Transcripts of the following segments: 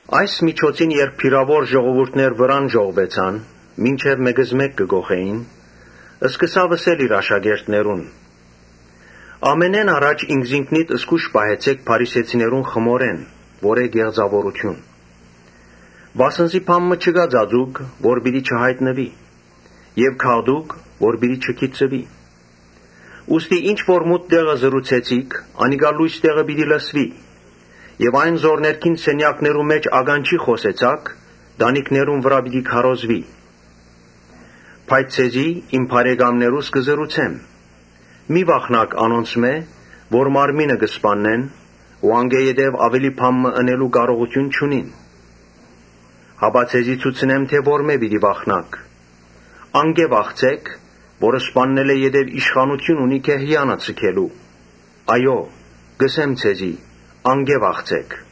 Այն միջոցին երբ բիւրաւոր ժողովուրդներ վրան ժողվուեցան՝ գրեթէ մէկզմէկ կը կոխէին՝ ըսաւ իր աշակերտներուն. «Ամենէն առաջ ինքզինքնիդ զգոյշ պահեցէք փարիսեցիներուն խմորէն, որ է կեղծաւորութիւն։ Վասն զի բան մը չկայ ծածուկ՝ որ պիտի չյայտնուի եւ գաղտուկ՝ որ չգիտցուի։ Ուստի ինչ որ մութ տեղը ըսիք, անիկա լոյս տեղը պիտի լսուի եւ այն որ ներքին սենեակներու մէջ ականջի խօսեցաք, տանիքներու վրայ պիտի քարոզուի»։ «Բայց ձեզի՝ իմ բարեկամներուս, կ’ըսեմ. ‘Մի՛ վախնաք անոնցմէ՝ որ մարմինը կը սպաննեն ու անկէ աւելի բան մը ընելու կարողութիւն չունին։ Հապա ձեզի ցուցնեմ թէ որմէ՛ պէտք է վախնաք. Անկէ վախցէք՝ որ սպաննելէ յետոյ իշխանութիւն ունի գեհեանը ձգելու։ Այո՛, կ’ըսեմ ձեզի, Անկէ վախցէք’։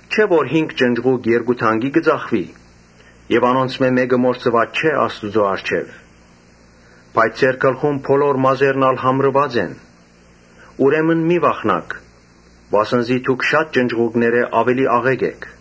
Չէ՞ որ հինգ ճնճղուկ երկու դանկի կը ծախուի եւ անոնցմէ մէ՛կը մոռցուած չէ Աստուծոյ առջեւ։ Բայց ձեր գլխուն բոլոր մազերն ալ համրուած են. ուրեմն մի՛ վախնաք, վասն զի դուք շատ ճնճղուկներէ աւելի աղէկ էք»։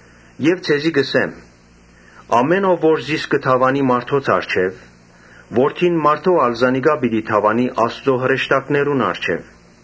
«Եւ ձեզի կ’ըսեմ. ‘Ամէն ով որ զիս կը դաւանի մարդոց առջեւ, Որդին մարդոյ ալ զանիկա պիտի դաւանի Աստուծոյ հրեշտակներուն առջեւ։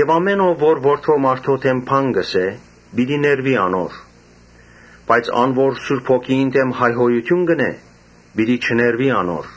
‘Ամէն ով որ Որդին մարդոյ դէմ բան ըսէ, պիտի ներուի անոր, բայց ան որ Սուրբ Հոգիին դէմ հայհոյութիւն ընէ, պիտի չներուի անոր’։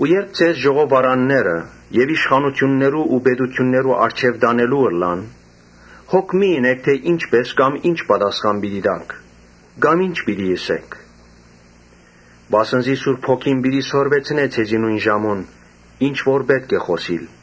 Երբ ձեզ ժողովարանները եւ իշխանութիւններու ու պետութիւններու առջեւ տանելու ըլլան, հոգ մի՛ ընէք թէ ի՞նչպէս կամ ի՞նչ պատասխան պիտի տաք, կամ ի՞նչ պիտի ըսէք, Վասն զի Սուրբ Հոգին պիտի սորվեցնէ ձեզի նոյն ժամուն՝ ինչ որ պէտք է խօսիլ»։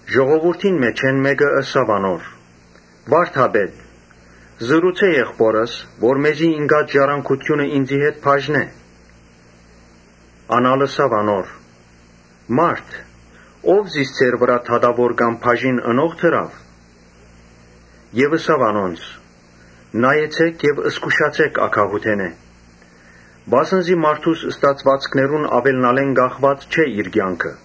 Ժողովուրդին մէջէն մէկը ըսաւ անոր. «Վա՛րդապետ, ըսէ եղբօրս, որ մեզի ինկած ժառանգութիւնը ինծի հետ բաժնէ»։ Ան ալ ըսաւ անոր. «Մա՛րդ, ո՞վ զիս ձեր վրայ դատաւոր կամ բաժին ընող դրաւ»։ Եւ աւելցուց. «Նայեցէ՛ք եւ զգուշացէ՛ք ագահութենէ. վասն զի մարդուս ստացուածքներուն աւելնալէն կախուած չէ իր կեանքը»։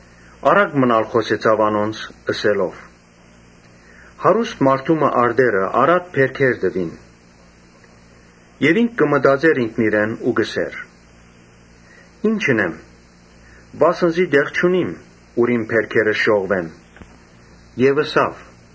Առակ մըն ալ խօսեցաւ անոնց՝ ըսելով. «Հարուստ մարդու մը արտերը առատ բերքեր տուին։ Ան կը մտածէր ինքնիրեն ու կ’ըսէր. ‘Ի՞նչ ընեմ, վասն զի տեղ չունիմ, ուր իմ բերքերս ժողվեմ’։ Եւ ըսաւ.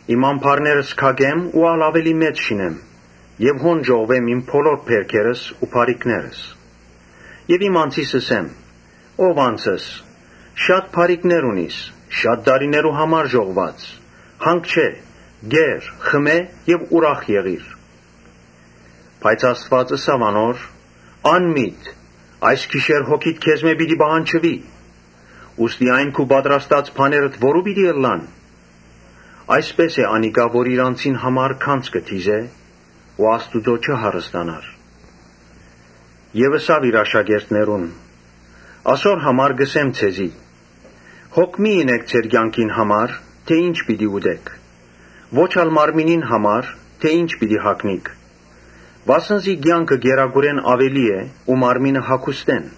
‘Իմ ամբարներս քակեմ ա՛լ աւելի մեծը շինեմ եւ հոն ժողվեմ իմ բոլոր բերքերս ու բարիքներս’. Եւ իմ անձիս ըսեմ. ‘Ո՛վ անձս, շատ բարիքներ ունիս շատ տարիներու համար ժողվուած. հանգչէ՛, կե՛ր, խմէ՛ եւ ուրախ եղի՛ր’։ Բայց Աստուած ըսաւ անոր. ‘Անմի՛տ, այս գիշեր հոգիդ քեզմէ պիտի պահանջուի. ուստի այն քու պատրաստած բաներդ որո՞ւ պիտի ըլլան’։ Այսպէս է անիկա, որ իր անձին համար գանձ կը դիզէ, բայց Աստուծոյ չի հարստանար»։ Եւ ըսաւ իր աշակերտներուն. «Ասոր համար կ’ըսեմ ձեզի, հոգ մի՛ ընէք ձեր կեանքին համար՝ թէ ի՞նչ պիտի ուտէք, ո՛չ ալ մարմինին համար՝ թէ ի՞նչ պիտի հագնիք. Վասն զի կեանքը կերակուրէն աւելի է ու մարմինը՝ հագուստէն։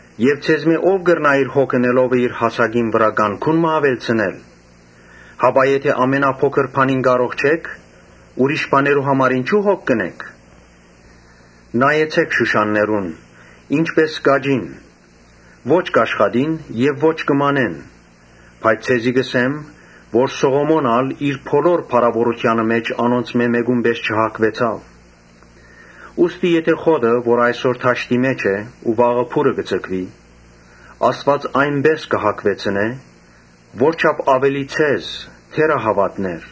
Ձեզմէ ո՞վ կրնայ իր հոգ ընելովը հասակին վրայ կանգուն մը աւելցնել։ Հապա եթէ ամենափոքր բանին կարող չէք, ուրիշ բաներու համար ինչո՞ւ հոգ կ’ընէք։ Նայեցէ՛ք շուշաններուն, ի՛նչպէս կ’աճին։ Ո՛չ կ’աշխատին եւ ո՛չ կը մանեն. բայց ձեզի կ’ըսեմ թէ Սողոմոն ալ իր բոլոր փառաւորութեանը մէջ անոնցմէ մէ՛կուն պէս չհագուեցաւ։ Ուստի եթէ խոտը, որ այսօր դաշտի մէջ է ու վաղը փուռը պիտի ձգուի, Աստուած այնպէս կը հագուեցնէ, ո՜րչափ աւելի ձեզ, թե՛րահաւատներ։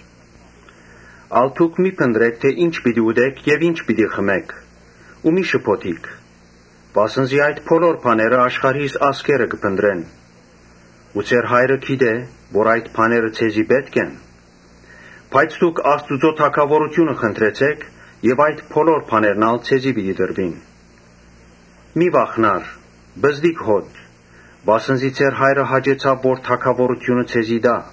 Ալ դուք մի՛ փնտռէք թէ ի՞նչ պիտի ուտէք եւ ի՞նչ պիտի խմէք ու մի՛ շփոթիք. Վասն զի այդ բոլոր բաները աշխարհիս ազգերը կը փնտռեն։ Ձեր Հայրը գիտէ թէ ասոնք ձեզի պէտք են։ Բայց դուք Աստուծոյ թագաւորութիւնը խնդրեցէք եւ այդ բոլոր բաներն ալ ձեզի պիտի տրուին»։ «Մի՛ վախնար, պզտկ հօտ, վասն զի ձեր հայրը հաճեցաւ, որ թագաւորութիւնը ձեզի տայ։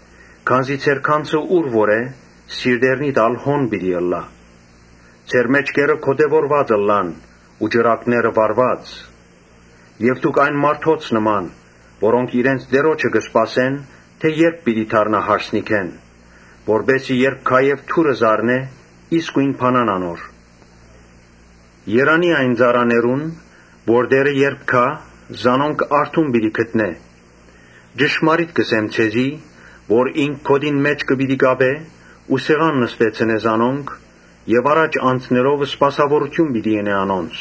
Քանզի ձեր գանձը ուր որ է, սրտերնիդ ալ հոն պիտի ըլլայ»։ «Ձեր մէջքերը գօտեւորուած ըլլան ու ճրագները վառուած։ Դուք եղէք այն մարդոց նման՝ որոնք իրենց տիրոջը կը սպասեն, թէ ե՞րբ պիտի դառնայ հարսանիքէն. որպէս զի երբ գայ եւ դուռը զարնէ, իսկոյն բանան անոր։ Երանի՜ այն ծառաներուն, որ երբ տէրը գայ՝ զանոնք արթուն պիտի գտնէ. ճշմարիտ կ’ըսեմ ձեզի, որ ինք գօտին մէջքը պիտի կապէ ու սեղան նստեցնէ զանոնք եւ առաջ անցնելով սպասաւորութիւն պիտի ընէ անոնց։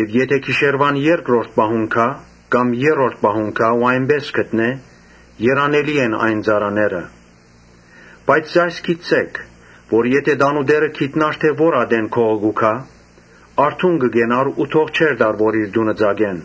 Եթէ գիշերուան երկրորդ պահուն գայ, կամ երրորդ պահուն գայ ու արթուն գտնէ, երանելի են այն ծառաները։ Բայց այս գիտցէք, թէ՝ եթէ տանտէրը գիտնար թէ ո՞ր ատեն գողը կու գայ, արթուն կը կենար ու թող չէր տար որ իր տունը ծակէ։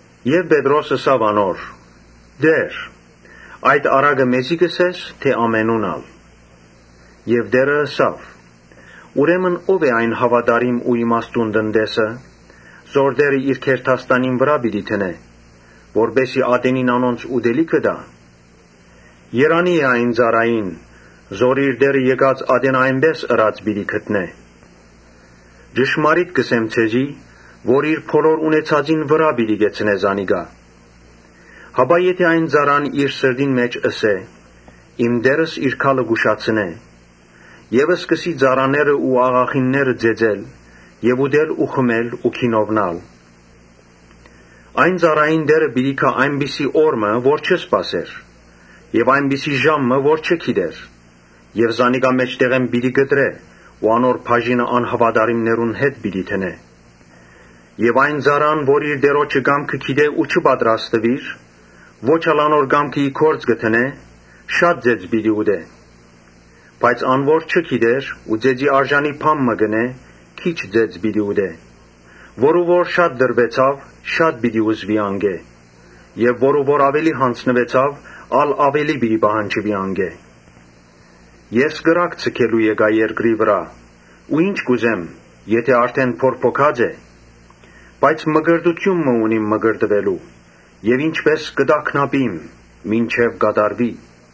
Պետրոս ըսաւ անոր. «Տէ՛ր, այդ առակը մե՞զի կ’ըսես թէ ամենուն ալ»։ Տէրը ըսաւ. «Ուրեմն ո՞վ է այն հաւատարիմ ու իմաստուն տնտեսը, որ տէրը իր գերդաստանին վրայ պիտի դնէ, որպէս զի ատենին անոնց ուտելիքը տայ։ Երանի՜ է այն ծառային, որ իր տէրը եկած ատենը այնպէս ըրած պիտի գտնէ։ Ճշմարիտ կ’ըսեմ ձեզի, որ իր բոլոր ունեցածին վրայ պիտի կեցնէ զանիկա։ Հապա եթէ այն ծառան իր սրտին մէջ ըսէ. ‘Իմ տէրս իր գալը կ’ուշացնէ’ եւ սկսի ծառաները ու աղախինները ծեծել եւ ուտել ու խմել ու գինովնալ։ Այն ծառային տէրը պիտի գայ այնպիսի օր մը, որ չի սպասեր եւ այնպիսի ժամ մը, որ չի գիտեր եւ զանիկա մէջտեղէն պիտի կտրէ ու անոր բաժինը անհաւատարիմներուն հետ պիտի դնէ։ Այն ծառան որ իր տիրոջը կամքը գիտէ ու չի պատրաստուիր, ո՛չ ալ անոր կամքը ի գործ կը դնէ, շատ ծեծ պիտի ուտէ։ Բայց ան որ չի գիտեր ու ծեծի արժանի բան մը ընէ, քիչ ծեծ պիտի ուտէ։ Որու որ շատ տրուեցաւ, շատ պիտի ուզուի անկէ եւ որու որ աւելի յանձնուեցաւ, ա՛լ աւելի պիտի պահանջուի անկէ»։ «Ես կրակ ձգելու եկայ երկրի վրայ ու ի՞նչ կ’ուզեմ եթէ արդէն բորբոքած է։ Բայց մկրտութիւն մը ունիմ մկրտուելու եւ ի՜նչպէս կը տագնապիմ մինչեւ կատարուի։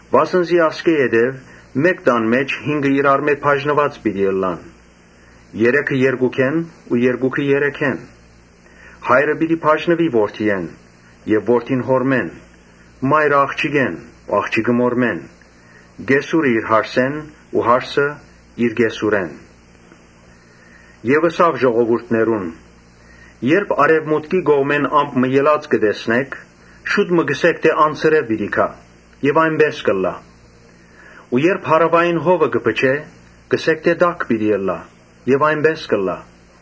Վասն զի ասկէ ետք մէկ տան մէջ հինգը իրարմէ բաժնուած պիտի ըլլան, երեքը՝ երկուքէն ու երկուքը՝ երեքէն։ Հայրը պիտի բաժնուի որդիէն եւ որդին՝ հօրմէն, մայրը՝ աղջիկէն ու աղջիկը՝ մօրմէն, կեսուրը՝ իր հարսէն ու հարսը՝ իր կեսուրէն»։ Ըսաւ ժողովուրդին. «Երբ արեւմուտքի կողմէն ամպ մը ելած տեսնէք, շուտ մը կ’ըսէք թէ ‘Անձրեւ պիտի գայ’ եւ այնպէս ալ կ’ըլլայ։ Ու երբ հարաւային հովը փչէ, կ’ըսէք թէ ‘Տաք պիտի ըլլայ’ եւ այնպէս ալ կ’ըլլայ։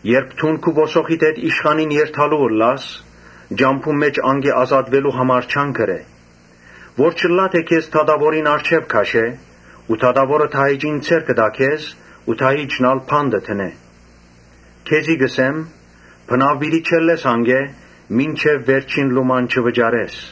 Երբ դուն քու ոսոխիդ հետ իշխանին երթալու ըլլաս, ճամբուն մէջ անկէ ազատուելու ջանք ըրէ, որ չըլլայ թէ քեզ դատաւորին առջեւ քաշէ ու դատաւորը դահիճին ձեռքը տայ քեզ ու դահիճն ալ բանտը դնէ։ Քեզի կ’ըսեմ, բնաւ պիտի չելլես անկէ, մինչեւ վերջին լուման չվճարես»։